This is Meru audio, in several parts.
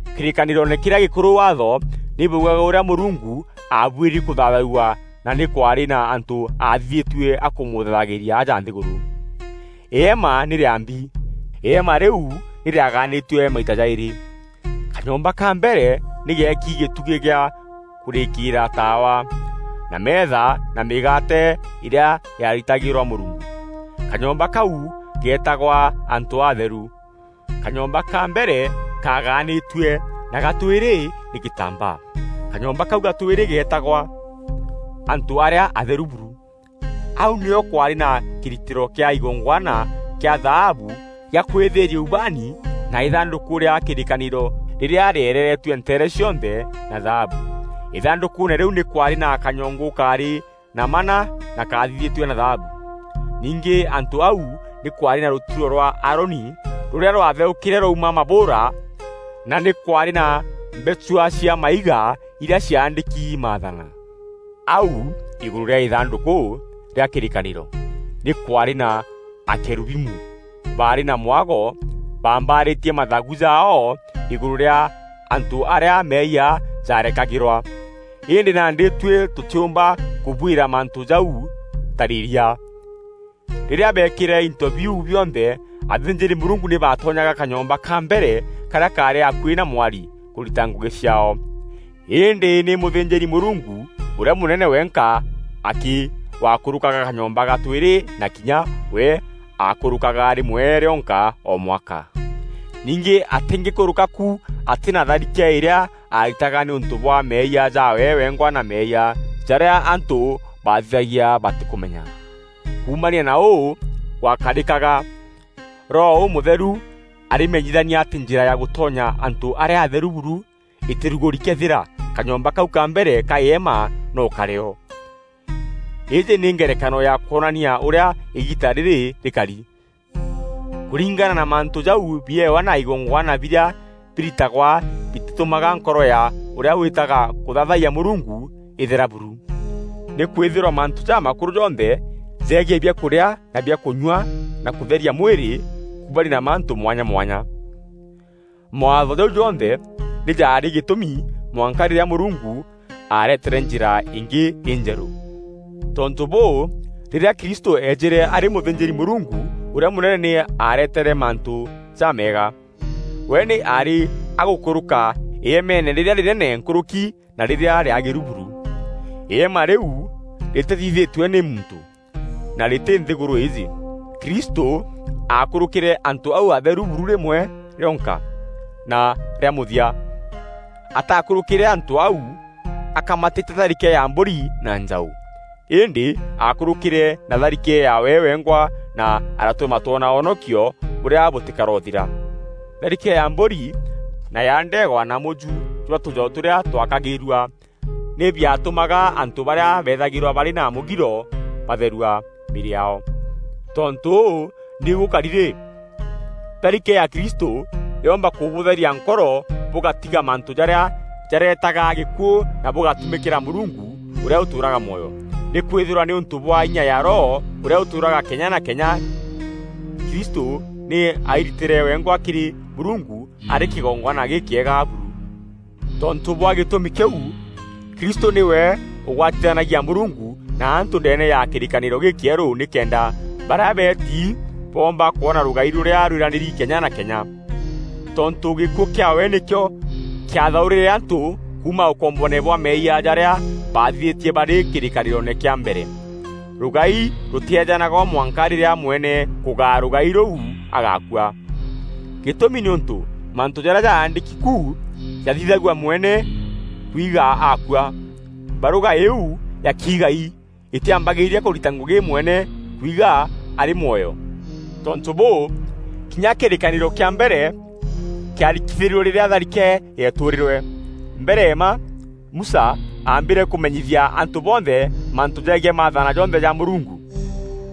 Kîrîkanîroone kîrîa gîkûrû Waatho nî bwaugaga ûrîa Mûrungu aabuîri kûthaathawua na nî kwaarî na antû aathithîtue a kûmûthaathagîria aja nthîgûrû. Îema nî rîambi. Îema rîu nî rîagaanîtue maita jaîrî. Kanyomba ka mbere nî geeki gîtûgî gîa kûrîkîîra taawa, na meetha na mîgaate îrîa yaaritagîrwa Mûrungu. Kanyomba kau geetagwa Antû Atheru. Kanyomba ka mbere kaagaanîtue na ga twîrî nî gîtambaa. Kanyomba kau ga twîrî geetagwa, antû arîa atheru buru. Au nîo kwaarî na kîritîro kîa igongwana kîa thaabu gîa kwîthîîria ubaani na Îthandûkû rîa kîrîkanîro rîrîa rîereeretue nteere cionthe na thaabu. Îthandûkûûne rîu nî kwaarî na kanyongu kaarî na manna na kaathithîtue na thaabu. Ningî antû au nî kwaarî na rûturo rwa Aaroni rûrîa rwatheûkîre rwauma mabûûra, na nî kwaarî na mbechua cia maiga irîa ciaandîki maathana. Au îgûrû rîa Îthandûkû rîa kîrîkanîro nî kwaarî na akerubimu barî na mwago baambaarîtie mathagu jaao îgûrû rîa antû arîa meeyia jaarekagîrwa. Îndî nandî tuî tûtîûmba kûbwîra mantû jau tarîîria. Rîrîa beekîre into biu bionthe, athînjîri-Mûrungu nî baatonyaga kanyomba ka mbere karîa kaarî akuî na mwari kûrita ngûgî ciaao. Îndî nî mûthînjîri-Mûrungu ûrîa mûnene wenka akî waakûrûkaga kanyomba ga twîrî na kinya we aakûrûkaga rîmwe rîonka o mwaka. Ningî atîngîkûrûka ku atî na tharike îrîa aaritaga nîûntû bwa meeyia jaawe wengwa na meeyia jarîa antû baathithagia batîkûmenya. Kuumania na ûu gwakarîkaga, Roho Ûmûtheru arîmenyithania atî njîra ya gûtonya antû arîa atheru buru îtîrugûri këethîra kanyomba kau ka mbere ka îema noo karî o. Îîjî nî ngerekano ya kwonania ûrîa îgiita rîrî rîkari. Kûringana na mantû jau biewa na igongwana birîa biritagwa bitîtûmaga nkoro ya ûrîa wîtaga kûthaathayia Mûrungu îthera buru. Nîkwîthîrwa mantû ja makûrû jonthe jegiî biakûrîa na biakunyua na kûtheria mwîrî kuumania na mantû mwanya mwanya. Mawaatho jau jonthe nî jaarî gîtûmi mwanka rîrîa Mûrungu aaretere njîra îngî înjerû. Tontû bûû, rîrîa Kristû eejîre arî mûthînjîri-Mûrungu ûrîa mûnene nî aaretere mantû jameega. We nî aarî agûkûrûka îemeene rîrîa rînene nkûrûki na rîrîa rîagîru buru. Îema rîu rîtîthithîtue nî muntû, na rîtî nthîgûrû îîjî. Kristû aakûrûkîre antû au atheru buru rîmwe rionka na rîa mûthia. Ataakûrûkîre antû au akamatîte tharike ya mbûri na njaû, îndî aakûrûkîre na tharike yaawe wengwa na aratûma twona wonokio bûrîa bûtîkorothira. Tharike ya mbûri na ya ndeegwa na mûju jwa tûjaû tûrîa twakagîîrua nî biatûmaga antû barîa beethagîrwa barî na mûgiro batherua mîîrî yaao. Tontû ûu nîu gûkari rî, tharike ya Kristû yoomba kûbûtheria nkoro bûgatiga mantû jarîa jareetaga gîkuû na bûgatumîkîra Mûrungu ûrîa ûtûûraga mwoyo. Nîkwîthîrwa nîûntû bwa inya ya Roho ûrîa ûtûûraga kenya na kenya, Kristû nî airitîre wengwa kîrî Mûrungu arî kîgongwana gîkîega buru. Tontû bwa gîtûmi kîu, Kristû nîwe ûgwatithanagia Mûrungu na antû ndeene ya kîrîkanîro gîkîerû nîkenda barîa beeti boomba kwona rûgai rûrîa rwîranîri kenya na kenya. Tontû gîkuû kîaawe nîkîo kîathaûrîre antû kuuma ûkomboone bwa meeyia jarîa baathithîtie barî kîrîkanîroone kîa mbere. Rûgai rûtîeejanagwa mwanka rîrîa mwene kûgaa rûgai rûu agakua. Gîtûmi nîûntû mantû jarîa jaandîki ku jathithagua mwene kuigaa akua. Barûga îîu ya kiigai îtîambagîîria kûrita ngûgî mwene kwigaa arî mwoyo. Tontû bûû, kinya kîrîkanîro kîa mbere kîarikithîrue rîrîa tharike yeetûrîrwe. Mbere mma Musa aambîre kûmenyithia antû bonthe mantû jegiî maathana jonthe ja Mûrungu,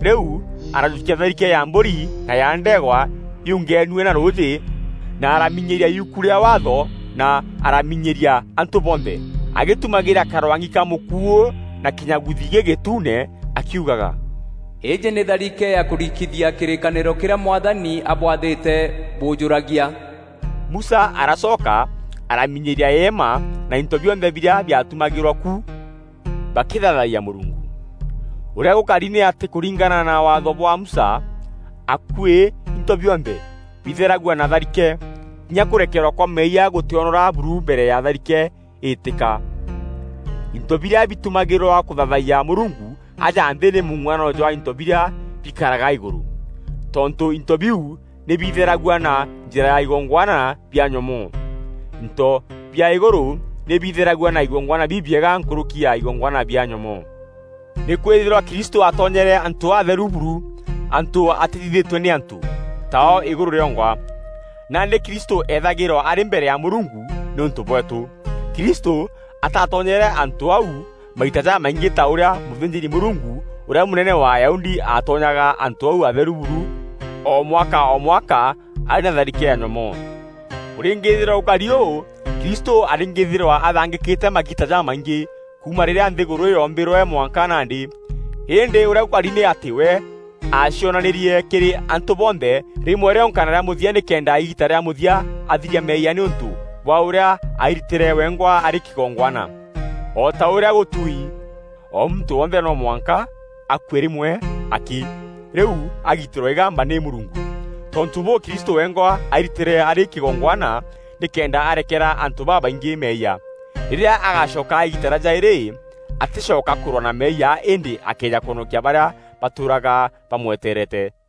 rîu arajûkia tharike ya mbûri na ya ndeegwa yuungenue na rûûjî na araminyîria yuku rîa Waatho na araminyîria antû bonthe agîtûmagîra karwang'i ka mûkuû na kînyaguthi gîgîtuune akiugaga, “Îîjî nî tharike ya kûrikithia kîrîkanîro kîrîa Mwathani abwathîte bûûjûragia.” Musa aracoka araminyîria îema na into bionthe birîa biatumagîrwa ku bakîthaathayia Mûrungu. Ûrîa gûkari nî atî kûringana na Waatho bwa Musa akuî into bionthe bitheragua na tharike. Kinya kûrekerwa kwa meeyia gûtîonora buru mbere ya tharike îîtîka. Into birîa bitumagîrwa kûthaathayia Mûrungu aja nthî nî mûng'uanano jwa into birîa bikaraga îgûrû. Tontû into biu nî bitheragua na njîra ya igongwana bia nyomoo, into bia îgûrû nî bitheragua na igongwana bibiega nkûrûki ya igongwana bia nyomoo. Nîkwîthîrwa Kristû aatonyere antû atheru buru, antû atîthithîtue nî antû, ta o îgûrû rîongwa. Nandî Kristû eethagîrwa arî mbere ya Mûrungu nîûntû bweetû. Kristû atatonyere antû au maita jamaingî ta ûrîa mûthînjîri-Mûrungu ûrîa mûnene wa Ayahudi atonyaga antû au atheru buru o mwaka o mwaka arî na tharike ya nyomoo. Kûrîngîîthîrwa gûkari ûu Kristû arîngîîthîrwa athangîkîte magiita jamaingî kuuma rîrîa nthîgûrû yoombîrwe mwanka nandî. Îndî ûrîa gûkari nî atî we aacionanîrie kîrî antû bonthe rîmwe rîonka na rîa mûthia nîkenda îgiita rîa mûthia athiria meeyia nîûntû bwa ûrîa airitîre wengwa arî kîgongwana. O ta ûrîa gûtuui, o muntû wonthe no mwanka akue rîmwe akî rîu agiitîrwe îgamba nî Mûrungu. Tontû bûû, Kristû wengwa airitîre arî kîgongwana nîkenda arekera antû babaingî meeyia. Rîrîa agacoka îgiita rîa jaîrî, atîcoka kûrwaa na meeyia îndî akeeja kwonokia barîa batûûraga bamweteerete.